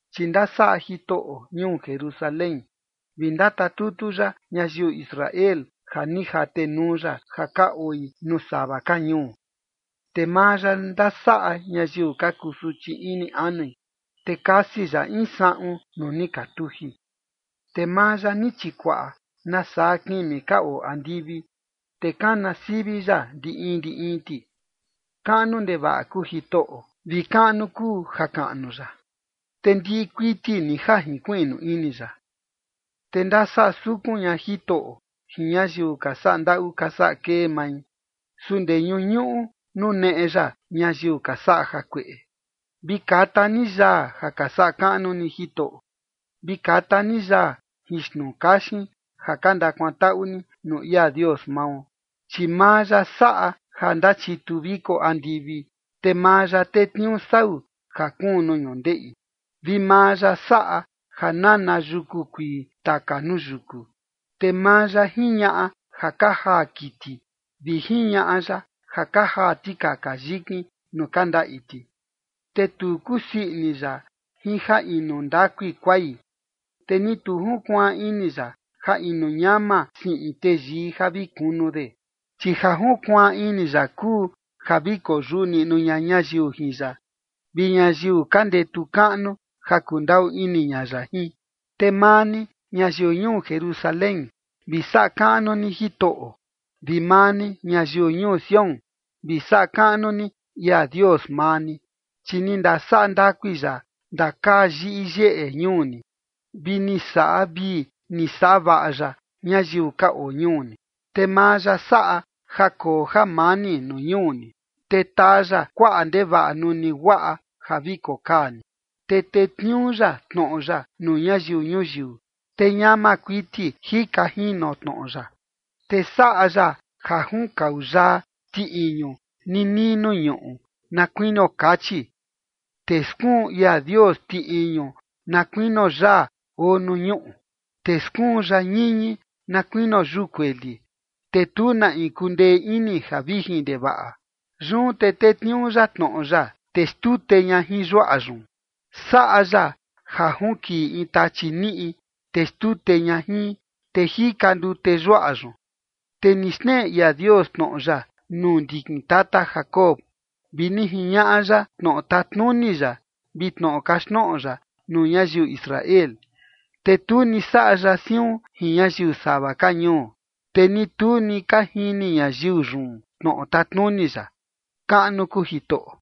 Chi ndasaꞌa Jitoꞌo ñuu Jerusalén, te ndatatutu ya ñayiu Israel ja ni jatenuu ya ja ka oi nuu sava ka ñuu. Te maa ya ndasaꞌa ñayiu ka kusuchi ini anui, te kasi ya in saꞌun nuu ni ka tuji. Te maa ya ni chikuaꞌa nasaa kimi ka oo andivi, te kana sivi ya ndi in ndi in ti. Kaꞌnu ndevaꞌa kuu Jitoꞌo, vi kaꞌnu kuu jakaꞌnu ya, te ndiꞌi kuiti ni ja jinkuiꞌnu ini ya. Te ndasaꞌa sukun ña Jitoꞌo jin ñayiu ka saꞌa ndaꞌu ka saꞌa kee mai, su ndee ñuñuꞌu nuneꞌe ya ñayiu ka saꞌa jakueꞌe. Vi kata ni yaa ja ka saꞌa kaꞌnu ni Jitoꞌo. Vi kata ni yaa jin xnuu kaxin ja ka ndakuantaꞌu ni nuu ia Dios mao. Chi maa ya saꞌa ja ndachitu viko andivi, te maa ya tetniuu sau ja kuun nuu ñundeꞌi, vi maa ya saꞌa ja nana yuku kuii taka nuu yuku. Te maa ya jiñaꞌa ja ka jaa kiti, vi jiñaꞌa ya ja ka jaa tikaka yikin nuu ka ndaꞌi ti. Te tu kusii ini ya jin ja inu ndakui kuai, te ni tu junkuaan ini ya ja inu ñama siꞌin teyii ja vi kunu de. Chi ja junkuaan ini ya kuu ja vi koyuꞌu niꞌnu ña ñayiu jin ya, vi ñayiu ka ndetu kaꞌnu ja kundaꞌu ini ña ya jin. Te maa ni, ñayiu ñuu Jerusalén, vi saꞌa kaꞌnu ni Jitoꞌo. Vi maa ni, ñayiu ñuu Sión, vi saꞌa kaꞌnu ni ia Dios maa ni. Chi ni ndasaꞌa ndakui ya ndakaa yiꞌi yeꞌe ñuu ni, vi ni saꞌa vii ni saꞌa vaꞌa ya ñayiu ka oo ñuu ni. Te maa ya saꞌa ja koo jamani nuu ñuu ni, te taa ya kuaꞌa ndevaꞌa nuni guaꞌa ja vi kokaa ni. Te tetniuu ya tnoꞌo ya nuu ñayiu ñuyiu, te ñama kuiti jika jino tnoꞌo ya. Te saꞌa ya ja junkau yaa ti iñu ninii nuu ñuꞌu na kuinio kachi, te skuun ia Dios ti iñu na kuinio yaa oo nuu ñuꞌu. Te skuun ya ñiñi na kuinio yuu kueli, te tu na in kundee ini ja vijin ndevaꞌa. Yun te tetniuu ya tnoꞌo ya, te xtute ña jin yuaꞌa yun. Saꞌa ya ja junkiꞌi in tachi niꞌi, te xtute ña jin, te jika ndute yuaꞌa yun. Te ni xneꞌe ia Dios tnoꞌo ya nuu ndikin tata Jacob, vi ni jiñaꞌa ya tnoꞌo tatnuni ya vi tnoꞌo kaxtnoꞌo ya nuu ñayiu Israel. Te tu ni saꞌa ya siun jin ñayiu sava ka ñuu, te ni tu ni ka jini ñayiu yun tnoꞌo tatnuni ya. ¡Kaꞌnu kuu Jitoꞌo!